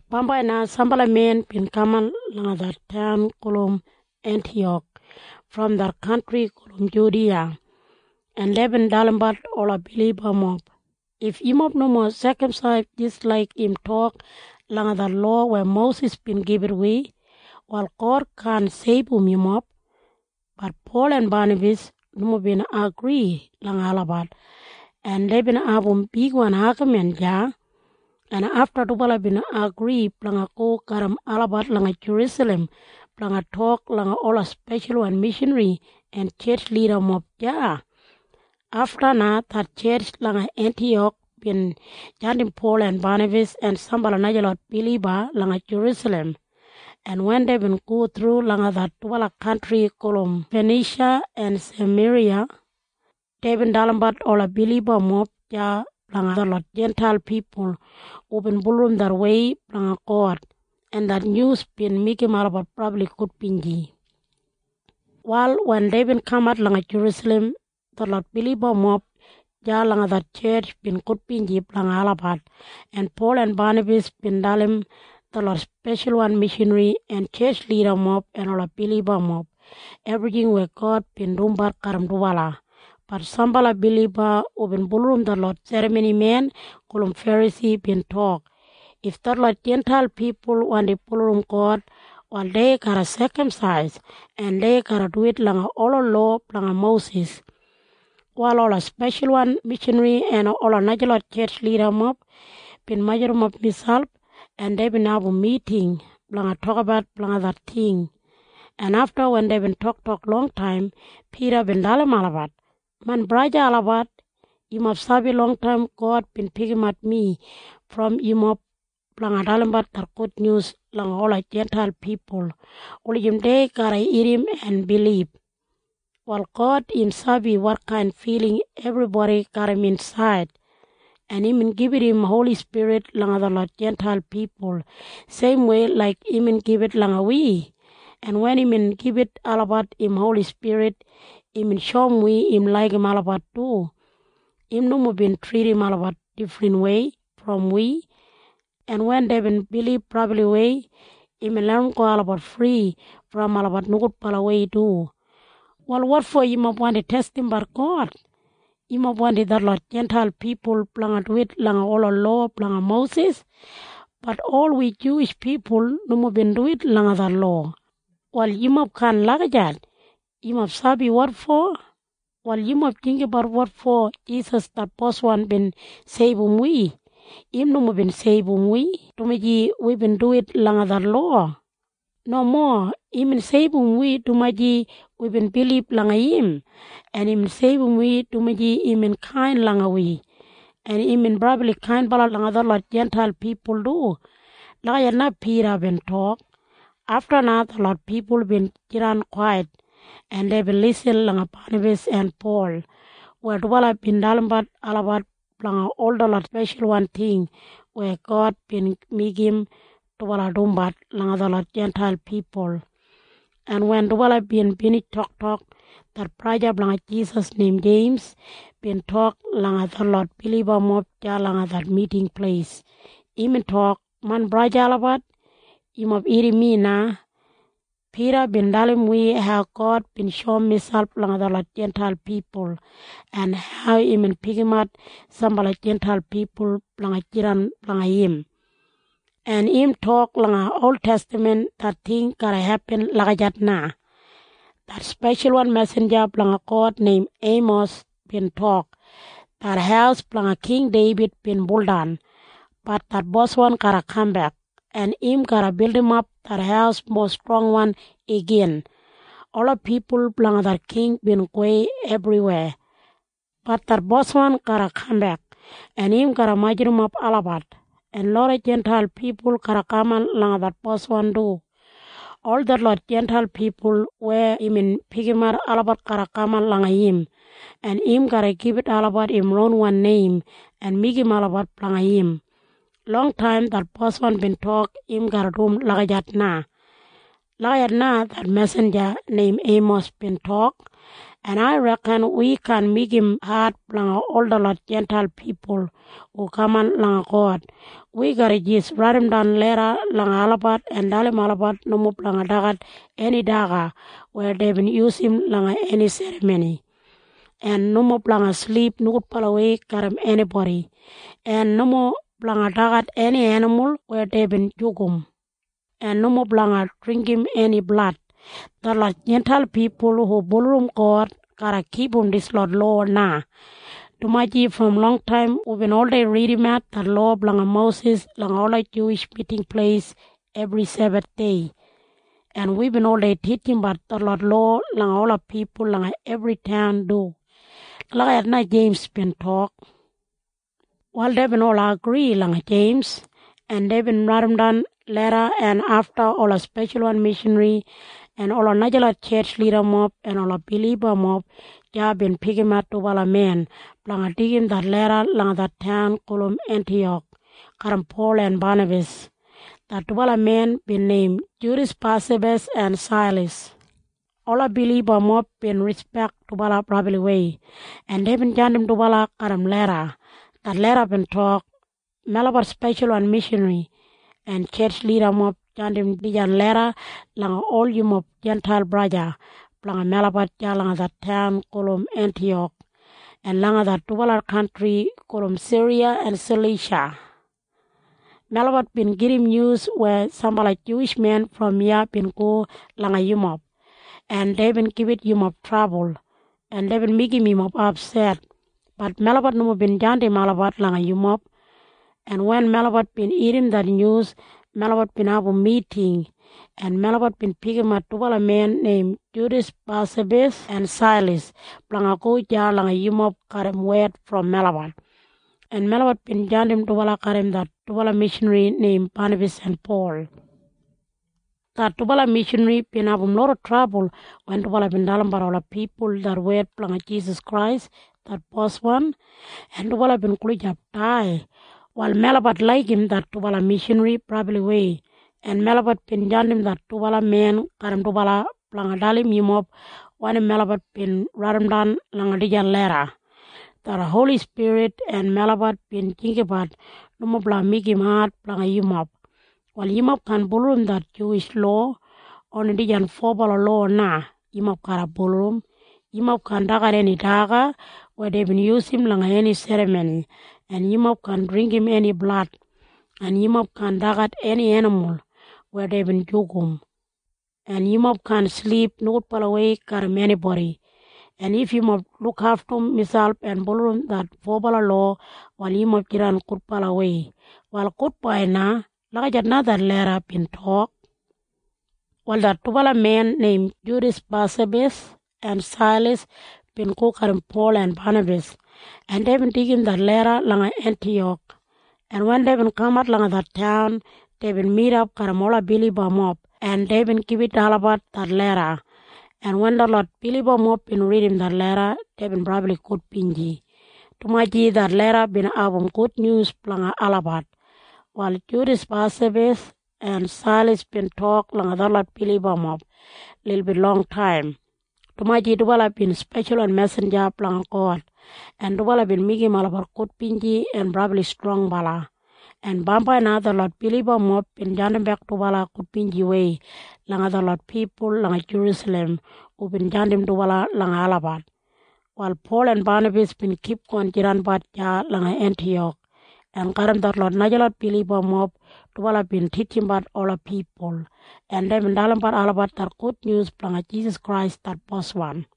Bambai na sambala men bin kaman langa det taun gulum Entiyak brom det kantri gulum Judiya, en deibin dalimbat ola bilibamob, “If yumob nomo sekamsais jis laik im tok langa det lowa weya Mosis bin gibit wi, wal God kaan seibum yumob.” Bat Pol en Banabas nomo bin agri langa olabat, en deibin abum bigwan agamin deya, en afta dubala bin agri blanga go garram olabat langa Jerusalem blanga tok langa ola speshalwan mishanri en tjetj lidamob deya. Afta na det tjetj langa Entiyak bin jandim Pol en Banabas en sambala najalot biliba langa Jerusalem, en wen deibin go thru langa det dubala kantri gulum Fanisha en Sameriya, deibin dalimbat ola bilibamob deya blanga detlot Jintail pipul hubin bulurrum det wei blanga God, en det nyus bin meigim olabat brabli gudbinji. Wal wen deibin kamat langa Jerusalem, detlot bilibamob deya langa det tjetj bin gudbinji blanga olabat, en Pol en Banabas bin dalim detlot speshalwan mishanri en tjetj lidamob en ola bilibamob ebrijing weya God bin dumbat garram dubala. Bat sambala biliba hubin bulurrum detlot serramonimen gulum Ferasi bin tok, “If detlot Jintail pipul wandi bulurrum God, wal dei garra sekamsais, en dei garra duwit langa ola lowa blanga Mosis.” Wal ola speshalwan mishanri en ola najalot tjetj lidamob bin majurrumap miselp, en deibin abum miting blanga tokabat blanga det ting, en afta wen deibin toktok longtaim, Pida bin dalim olabat, “Main braja olabat, yumob sabi longtaim God bin pikimat mi brom yumob blanga dalimbat det gudnyus langa ola Jintail pipul wulijim dei garra irrim en bilib. Wal God im sabi wotkain filing ebribodi garram insaid, en imbin gibit im Holi Spirit langa detlot Jintail pipul seimwei laik imbin gibit langa wi, en wen imbin gibit olabat im Holi Spirit, imbin shoum wi im laigim olabat du. Im nomo bin tridim olabat difrinwei brom wi, en wen deibin bilib brabliwei, imbin larramgo olabat fri brom olabat nogudbalawei du. Wal wotfo yumob wandi testimbat God? Yumob wandim detlot Jintail pipul blanga duwit langa ola lowa blanga Mosis. Bat ol wi Juwish pipul nomo bin duwit langa det lowa. Wal yumob kaan lagijat. Yumob sabi wotfo? Wal yumob jinggabat wotfo Jisas det Boswan bin seibum wi. Im nomo bin seibum wi dumaji wibin duwit langa det lowa. Nomo. Imbin seibum wi dumaji wibin bilib langa im, en imbin seibum wi dumaji imbin kain langa wi. En imbin brabli kainbala langa detlot Jintail pipul du.” Lagijat na Pida bin tok. Afta na detlot pipul bin jidan kwait, en deibin lisin langa Banabas en Pol weya dubala bin dalimbat olabat blanga ol detlot speshalwan ting weya God bin meigim dubala dumbat langa detlot Jintail pipul, en wen dubala bin binij toktok, det braja blanga Jisas neim Jeims bin tok langa detlot bilibamob deya langa det miting pleis. Imbin tok, “Main braja olabat, yumob irrim mi na. Pida bin dalim wi hau God bin shoum miselp langa detlot Jintail pipul en hau imbin pikimat sambala Jintail pipul blanga jidan blanga im. En im tok langa oltestaman det ting garra hepin lagijat na. Det speshalwan mesinja blanga God neim Eimos bin tok, ‘Det haus blanga King Deibid bin buldan. Bat det Boswan garra kambek, en im garra bildimap det haus mowa strongwan igin. Ola pipul blanga det king bin gowei ebriwei. Bat det Boswan garra kambek, en im garra majurrumap olabat, en loda Jintail pipul garra kaman langa det Boswan du. Ol detlot Jintail pipul weya imbin pikimat olabat garra kaman langa im, en im garra gibit olabat im ronwan neim en meigim olabat blanga im. Longtaim det Boswan bin tok im garra dum lagijat na.’ Lagijat na det mesinja neim Eimos bin tok. En ai reken wi kaan meigim ad blanga ol detlot Jintail pipul hu kaman langa God. Wi garra jis raidimdan leda langa olabat en dalim olabat nomo blanga dagat eni daga weya deibin yusum langa eni serramoni, en nomo blanga silip nogudbalawei garram enibodi, en nomo blanga dagat eni enimul weya deibin jugum, en nomo blanga dringgim eni blad. Detlot Jintail pipul hu bulurrum God garra kipum dislot lowa na, dumaji brom longtaim wibin oldei ridimat det lowa blanga Mosis langa ola Juwish Miting Pleis ebri Sebathdei, en wibin oldei titjimbat detlot lowa langa ola pipul langa ebri taun du.” Lagijat na Jeims bin tok. Wal deibin ol agri langa Jeims, en deibin raidimdan leda, en afta ola speshalwan mishanri en ola najalot tjetj lidamob en ola bilibamob deya bin pikimat dubala men blanga deigim det leda langa det taun gulum Entiyak garram Pol en Banabas. Det dubala men bin neim Judas Basabas en Sailas. Ola bilibamob bin rispek dubala brabliwei, en deibin jandim dubala garram leda. Det leda bin tok, “Melabat speshalwan mishanri en tjetj lidamob jandim dijan leda langa ol yumob Jintail braja blanga melabat deya langa det taun gulum Entiyak en langa det dubala kantri gulum Siriya en Salisha. Melabat bin gedim nyus weya sambala Juwish men brom iya bin go langa yumob, en deibin gibit yumob trabul, en deibin meigim yumob apset. Bat melabat nomo bin jandim olabat langa yumob. En wen melabat bin irrim det nyus, melabat bin abum miting, en melabat bin pikimat dubala men neim Judas Basabas en Sailas blanga go deya langa yumob garram wed brom melabat, en melabat bin jandim dubala garram det dubala mishanri neim Banabas en Pol. Det dubala mishanri bin abum loda trabul wen dubala bin dalimbat ola pipul det wed blanga Jisas Krais det Boswan, en dubala bin gulijap dai. Wal melabat laigim det dubala mishanri brabliwei, en melabat bin jandim det dubala men garram dubala blanga dalim yumob wanim melabat bin raidimdan langa dijan leda. Det Holi Spirit en melabat bin jinggabat nomo blanga meigim ad blanga yumob. Wal yumob kaan bulurrum det Juwish lowa. Oni dijan fobala lowa na yumob garra bulurrum. Yumob kaan dagat eni daga weya deibin yusum langa eni serramoni, en yumob kaan dringgim eni blad, en yumob kaan dagat eni enimul weya deibin jugum, en yumob kaan silip nogudbalawei garram enibodi. En if yumob lukaftum miselp en bulurrum det fobala lowa, wal yumob jidan gudbalawei. Wal gudbai na.” Lagijat na det leda bin tok. Wal det dubala men neim Judas Basabas en Sailas bin go garram Pol en Banabas, en deibin deigim det leda langa Entiyak, en wen deibin kamat langa det taun, deibin midap garram ola bilibamob, en deibin gibit olabat det leda, en wen detlot bilibamob bin ridim det leda, deibin brabli gudbinji, dumaji det leda bin abum gudnyus blanga olabat. Wal Judas Basabas en Sailas bin tok langa detlot bilibamob lilbit longtaim, dumaji dubala bin speshalwan mesinja blanga God, en dubala bin meigim olabat gudbinji en brabli strongbala, en bambai na detlot bilibamob bin jandimbek dubala gudbinjiwei langa detlot pipul langa Jerusalem hubin jandim dubala langa olabat. Wal Pol en Banabas bin kipgon jidanbat deya langa Entiyak, en garram detlot najalot bilibamob dubala bin titjimbat ola pipul, en deibin dalimbat olabat det gudnyus blanga Jisas Krais det Boswan.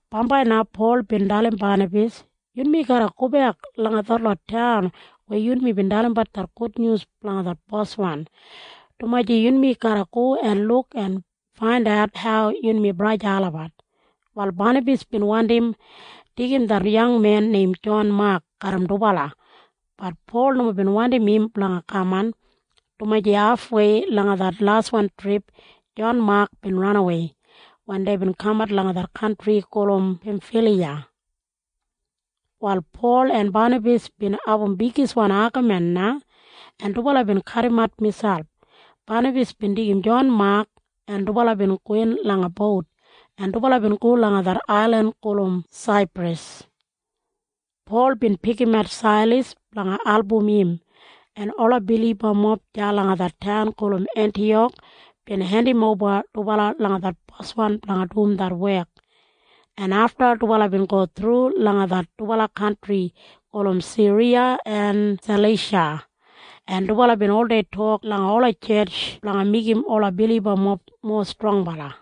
Bambai na Pol bin dalim Banabas, “Yunmi garra gobek langa ol detlot taun weya yunmi bin dalimbat det gudnyus blanga det Boswan, dumaji yunmi garra go en luk en faindat hau yunmi braja olabat.” Wal Banabas bin wandim deigim det yangmen neim Jon Mak garram dubala. Bat Pol nomo bin wandim im blanga kaman, dumaji hafwei langa det laswan trip Jon Mak bin ranawei wen deibin kamat langa det kantri gulum Pemfiliya. Wal Pol en Banabas bin abum bigiswan agamin na, en dubala bin kadimat miselp. Banabas bin deigim Jon Mak, en dubala bin gowin langa bout, en dubala bin go langa det ailin gulum Saipras. Pol bin pikimat Sailas blanga album im, en ola bilibamob deya langa det taun Entiyak bin hendimoba dubala langa det Boswan blanga dum det wek, en afta dubala bin go thru langa det dubala kantri gulum Siriya en Salisha, en dubala bin oldei tok langa ola tjetj blanga meigim ola bilibamob mowa strongbala.